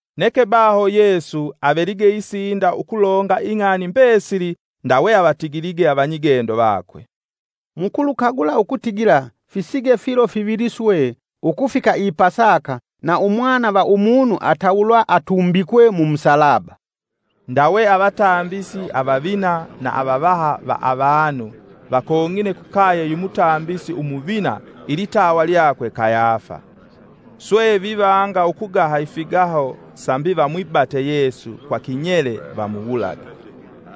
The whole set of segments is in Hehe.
Neke baho Yesu avelige isinda ukulonga ing'ani mbesili ndawe avatigilige avanyigendo vakwe, “Mukulukagula ukutigila fisige filo fivili swe ukufika i pasaka na Umwana va Umunu atawulwa atumbikwe mu musalaba.” Ndawe avatambisi avavina na avavaha va avanu vakong'ine kukaye yu mutambisi umuvina ilitawa lyakwe Kayafa. Swe vivanga ukugaha ifigaho sambi vamwibate Yesu kwa kinyele vamuwulage.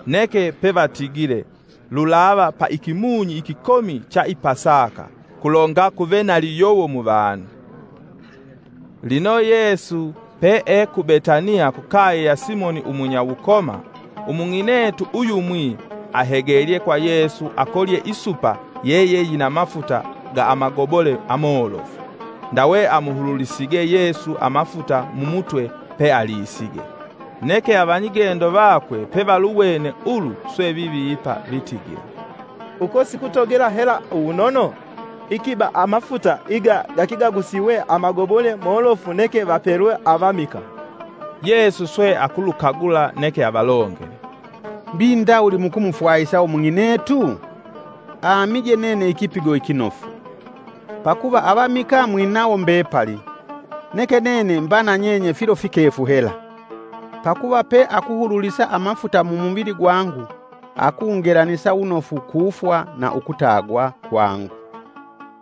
Neke pevatigile lulava pa ikimunyi ikikomi cha ipasaka, kulonga kuve naliyowo mu vanu. Lino Yesu pee ku Betaniya kukaye ya Simoni umunya wukoma, umung'inetu uyumwi ahegelye kwa Yesu akolye isupa yeyeyina mafuta ga amagobole amolofu, ndawe amuhululisige Yesu amafuta mu mutwe pealisige Neke avanyigendo vakwe pevaluwene ulu swe vivipa vitigila, “Uko sikutogela hela uwunono? Ikiba amafuta iga gekegagusiwe amagobole molofu neke vapelwe avamikaa.” Yesu swe akulukagula neke avalongele, “Mbi ndawuli mukumufwahisa umung'inetu? Amije nene ikipigo ikinofu. Pakuva avamikaa mwinawo mbepali neke nene mba na nyenye filo fikefu hela. Pakuva pe akuhululisa amafuta mumuvili gwangu akungelanisa wunofu kufwa na ukutagwa kwangu.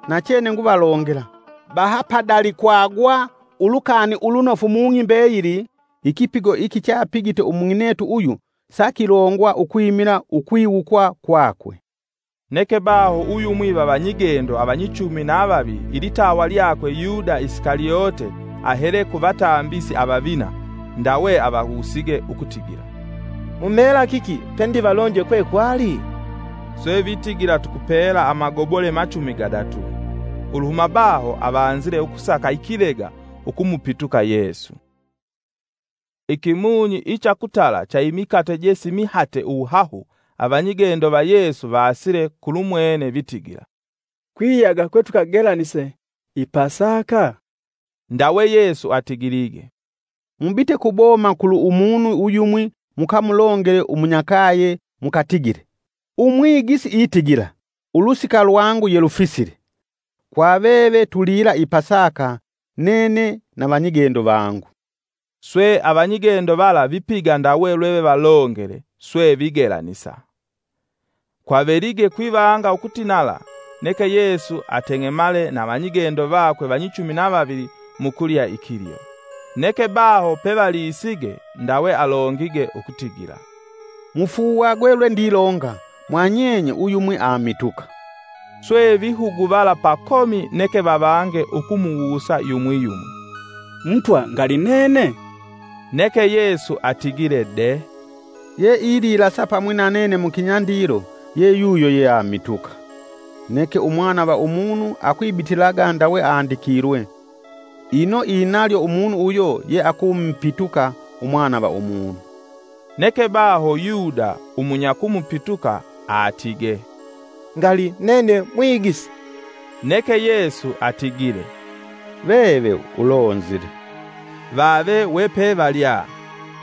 Nachene nguvalongela, baha padalikwagwa Ulukani Ulunofu mung'i mbeyili ikipigo iki chapigite umung'inetu uyu sakilongwa ukwimila ukwiwukwa kwakwe.” Neke baho uyumwi va vanyigendo avanyichumi na vavili ilitawa lyakwe Yuda Isikalyote ahele ku vatambisi avavina. Ndawe avawusige ukutigila, “Mumela kiki pe ndivalonje kwe kwali?” Swe vitigila tukupela amagobole machumi gadatu; Uluhuma baho avanzile ukusaka ikilega ukumupituka Yesu. Ikimunyi icha kutala cha imikate je simihate uwuhahu avanyigendo va Yesu vaasile kulumwene vitigila, “Kwiyaga kwetukagelanise i Pasaka?” Ndawe Yesu atigilige, “Mubite kuboma kulu umunu uyumwi mukamulongele umunyakaye mukatigile; ‘Umwigisi itigila, ulusika lwangu yelufisile. Kwa veve tulila i Pasaka nene na vanyigendo vangu.’” Swe avanyigendo vala vipiga ndawe lwevevalongele, swe vigelanisa. Kwavelige kwivanga ukutinala neke Yesu ateng'emale na avanyigendo vakwe vanyichumi na vavili mukulya ikilyo. Neke baho pevalisige ndawe alongige ukutigila, “mufuuwagwe lwendilonga, mwanyenye uyumwi amituka.” Swe vihuguvala pakomi neke vavange ukumuwusa yumwi yumwi, “Mutwa ngali nene?” Neke Yesu atigile de, “Ye ililasa pamwi na nene mukinyandilo ye yuyo ye amituka. Neke Umwana va Umunu akwibitilaga ndawe andikilwe, ino inalyo umunu uyo ye akumupituka Umwana va Umunu.” Neke baho Yuda umunyakumupituka aatige, “Ngali nene Mwigisi!” Neke Yesu atigile, “Veve ulonzile.” Vave wepevalya,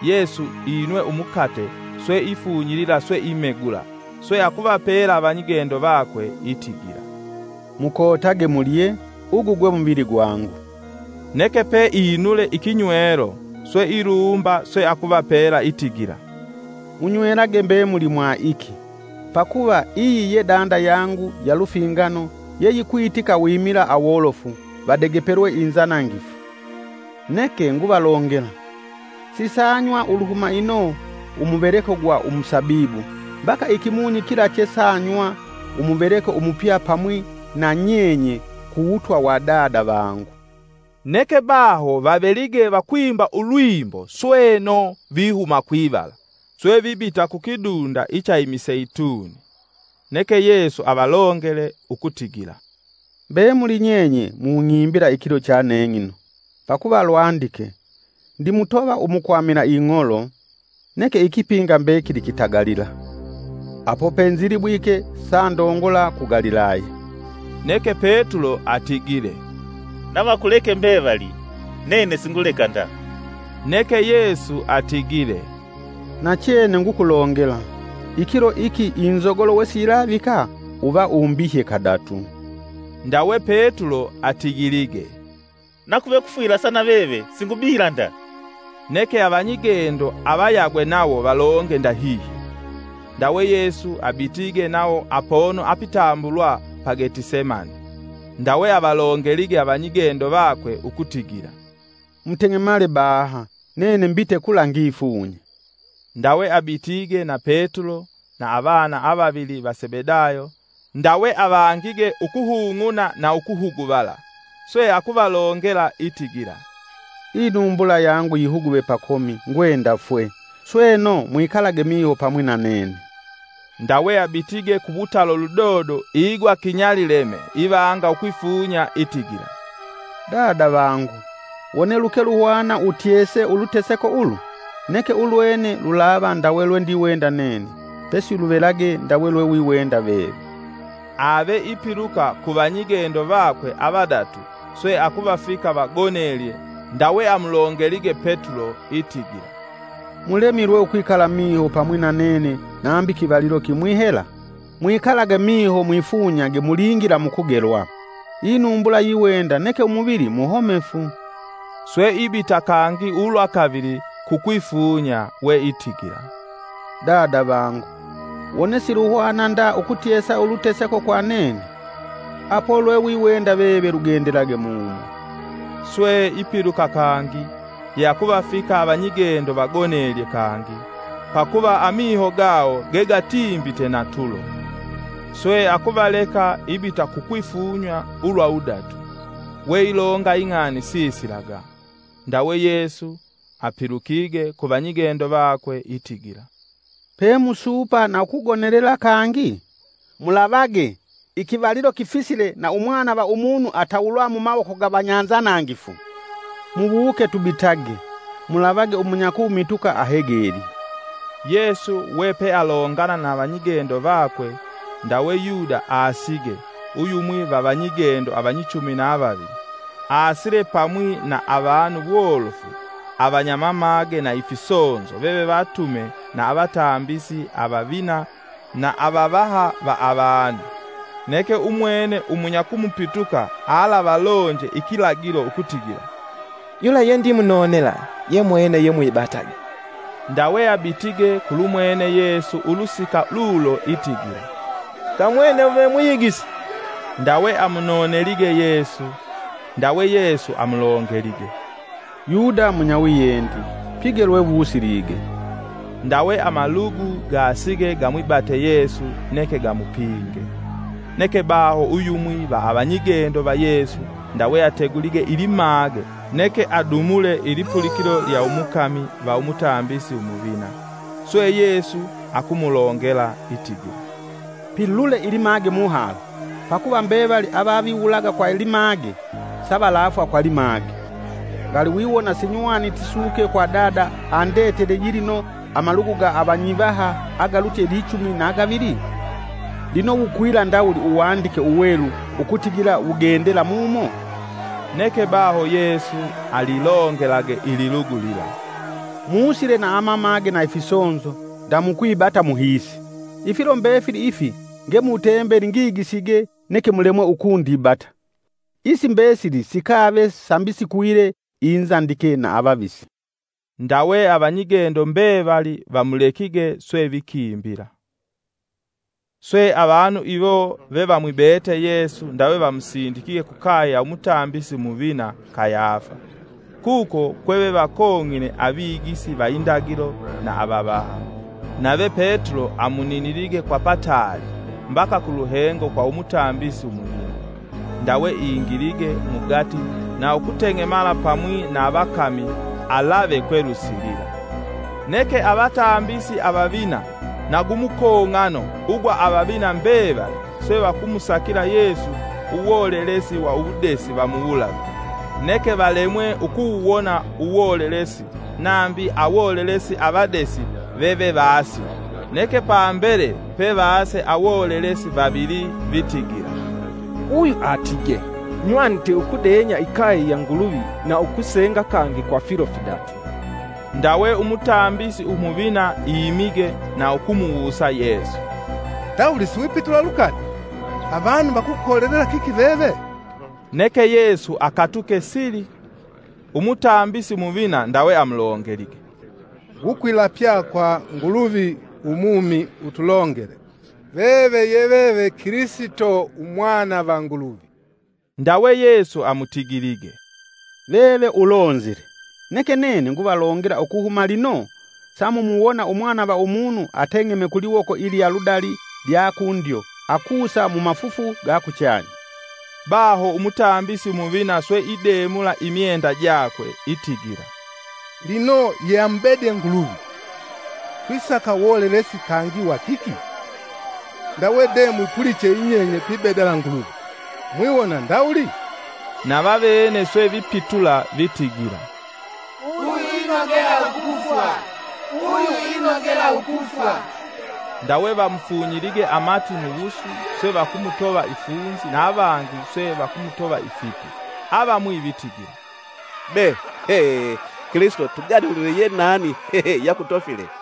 Yesu inwe umukate, swe ifunyilila swe imegula, swe akuvapela avanyigendo vakwe itigila, “Mukotage mulye, ugu gwe muvili gwangu.” Neke pe inule ikinywelo swe ilumba swe akuvapela itigila, “Munywelage mbemuli mwa iki, Pakuva iyi ye danda yangu ya lufingano ye yikwitika wimila awolofu vadegepelwe inzanangifu. Neke nguvalongela, sisanywa uluhuma ino umuveleko gwa umusabibu mbaka ikimunyi kila chesanywa umuveleko umupya pamwi na nyenye ku wutwa wa Dada vangu.” Neke baho vavelige vakwimba ulwimbo sweno vihuma kwivala, swe vibita kukidunda icha imiseituni. Neke Yesu avalongele ukutigila, “Mbemuli nyenye mung'imbila ikilo cha neng'ino, pakuva lwandike: ‘Ndimutova umukwamila ing'olo, neke ikipinga mbekili kitagalila.’ Apo penzilibwike sandongola ku Galilaya.” Neke Petulo atigile, “Navakuleke mbevali nene singuleka nda.” Neke Yesu atigile, “Nachene ngukulongela, ikilo iki inzogolo wesiyilavika uva umbihye kadatu.” Ndawe Petulo atigilige, “Nakuve kufwilasa naveve singubihila nda.” Neke avanyigendo avayagwe nawo valonge ndahihyo. Ndawe Yesu abitige nawo apono apitambulwa pa Getisemane. Ndawe avalongelige avanyigendo vakwe, ukutigila, “Muteng'emale baha nene mbite kula ngifunye.” Ndawe abitige na Petulo na avana avavili va Sebedayo, ndawe avangige, ukuhung'una na ukuhuguvala. Swe akuvalongela itigila, “Inumbula yangu yihuguve pakomi ngwenda fwe, sweno mwikalage miho pamwi na nene.” Ndawe abitige kuwutalo ludodo igwa kinyalileme ivanga ukwifunya itigila, “Dada vangu, wone luke luhwane utyese uluteseko ulu, neke ulwene lulava ndawe lwendiwenda nene, pesi luvelage ndawe lwewiwenda veve.” Ave ipiluka ku vanyigendo vakwe avadatu swe akuvafika vagonelye ndawe amulongelige Petulo itigila, “Mulemilwe ukwikala miho pamwi na nene nambi kivalilo kimwi hela? Mwikalage miho mwifunyage mulingila mukugelwa. Inumbula yiwenda neke umuvili muhomefu.” Swe ibita kangi ulwakavili kukwifunya we itigila, “Dada vangu, wone silwihwana nda ukutyesa uluteseko kwa nene, apo lwewiwenda veve lugendelage mumo.” Swe ipiluka kangi, ye akuvafika avanyigendo vagonelye kangi, pakuva amiho gayo ge gatimbite na tulo. Swe akuvaleka ibita kukwifunya ulwa wudatu, weilonga ing'ani sisilaga. Ndawe Yesu apilukige ku vanyigendo vakwe itigila, “Pe musuupa na ukugonelela kangi? Mulavage! ikivalilo kifisile na Umwana va Umunu atawulwa mumawoko ga vanyanzanangifu. Muwuke tubitage. Mulavage umunyakumituka ahegelye.” Yesu we pealongana na avanyigendo vakwe ndawe Yuda aasige uyumwi va vanyigendo avanyichumi na vavili. Aasile pamwi na avanu wolofu avanyamamage na ifisonzo vevevatume na avatambisi avavina na avavaha va avanu. Neke umwene umunyakumupituka alavalonje ikilagilo ukutigila: “Yula ye ndimunonela ye mwene yemwibatage.” Ndawe abitige kulumwene Yesu ulusika lulo itigila, “Kamwene ve Mwigisi.” Ndawe amunonelige Yesu. Ndawe Yesu amulongelige, “Yuda munyawiyendi pige lwewusilige.” Ndawe amalugu gaasige gamwibate Yesu neke gamupinge. Neke baho uyumwi va avanyigendo va Yesu ndawe ategulige ilimage neke adumule ilipulikilo lya umukami va umutambisi umuvina. Swe Yesu akumulongela itigila, “Pilule ilimage muhala, pakuva mbevali avaviwulaga kwa limage savalafwa kwa limage. Ngali wiwona sinywaniti suke kwa Dada andetele yilino amalugu ga avanyivaha agalutye lichumi na gavili? Lino wukwila ndawuli Uwandike Uwelu ukutigila wugendela mumo?” Neke baho Yesu alilongelage ililugu lila, “Muusile na amamage na ifisonzo ndamukwibata muhiisi, ifilo mbefili ifi nge mutembeli ngigisige neke mulemwe ukundibata. Isi mbesili sikave sambi sikwile inzandike na avavisi; ndawe avanyigendo mbevali vamulekige swe vikimbila.” Swe avanu iwo vevamwibete Yesu ndawe vamusindikige kukaye ya umutambisi umuvina Kayafa, kuko kwe vevakong'ine avigisi va indagilo na avavaha. Nave Petulo amuninilige kwa pataali mbaka kuluhengo kwa umutambisi umuvina, ndawe ingilige mugati na ukuteng'emala pamwi na avakami alave kwelwisilila. Neke avatambisi avavina na gumukong'ano ugwa avavina mbevali swe vakumusakila Yesu uwolelesi wa uwudesi vamuwulage. Neke valemwe ukuwuwona uwolelesi nambi awolelesi avadesi vevevaasile. Neke pambele pevaase awolelesi vavili vitigila, “Uyu aatige: ‘Nywanite ukudenya ikaye ya Nguluvi na ukusenga kangi kwa filo fidatu.’” Ndawe umutambisi umuvina iimige na ukumuwusa Yesu, “Ndawuli siwipitula lukani? Avanu vakukolelela kiki veve?” Neke Yesu akatuke sili. Umutambisi umuvina ndawe amulongelige, “Ngukwilapya kwa Nguluvi umumi utulongele, veve ye veve Kilisito Umwana va Nguluvi!” Ndawe Yesu amutigilige, “Veve ulonzile! Neke nene nguvalongela, ukuhuma lino samumuwona Umwana va Umunu ateng'eme kuliwoko ilinyaludali lya kundyo akusa mumafufu gakuchanya.” Baho umutambisi umuvina swe idemula imyenda jakwe, itigila, “Lino ye amubede Nguluvi! Twisaka wolelesi kangi wa kiki? Ndawe de mwipuliche yinyenye pibedala Nguluvi. Mwiwona ndawuli?” Navavene swe vipitula vitigila, “Uyu inogela ukufwa!” Ndawe vamufunyilige amati muwusu, swe vakumutova ifunzi na avangi swe vakumutova ifipi. Avamwi vitigila, “Be, Kilisito tuganulile ye nani ye akutofile!”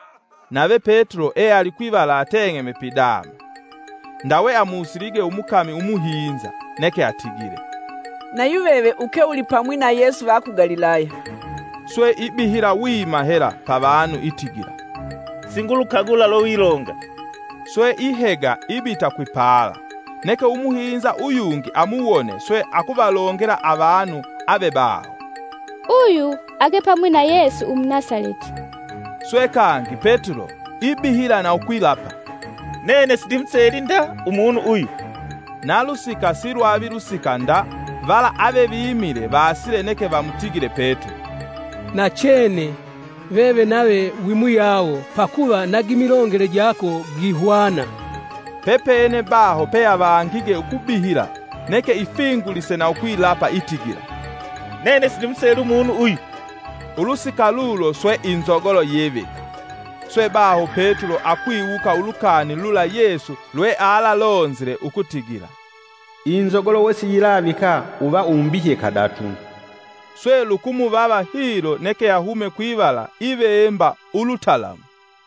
Nave Petulo ealikwivala ateng'eme pidama. Ndawe amusilige umukami umuhinza neke atigile, “Na yuveve ukeulipamwi na Yesu va ku Galilaya.” Swe ibihila wima hela pavanu itigila, “singulukagula lwewilonga.” Swe ihega ibita kwipala, neke umuhinza uyungi amuwone swe akuvalongela avanu avebaho, “Uyu ake pamwi na Yesu Umunasaleti.” Swe kangi Petulo ibihila na ukwilapa, “Nene sindimuseli nda Umunu uyu.” Nalusika silwavi lusika nda vala avevimile vaasile neke vamutigile Petulo, “Nachene, veve nave wimuyawo, pakuva na gimilongele jako gihwana.” Pepene baho peavangige ukubihila, neke ifingulise na ukwilapa itigila, “Nene sindimuseli umunu uyu!” Ulusika lulo swe inzogolo yivika. Swe baho Petulo akwiwuka ulukani lula Yesu lwealalonzile ukutigila, “Inzogolo wesiyilavika uva umbihye kadatu.” Swe lukumuvava hilo neke ahume kwivala ivemba ulutalamu.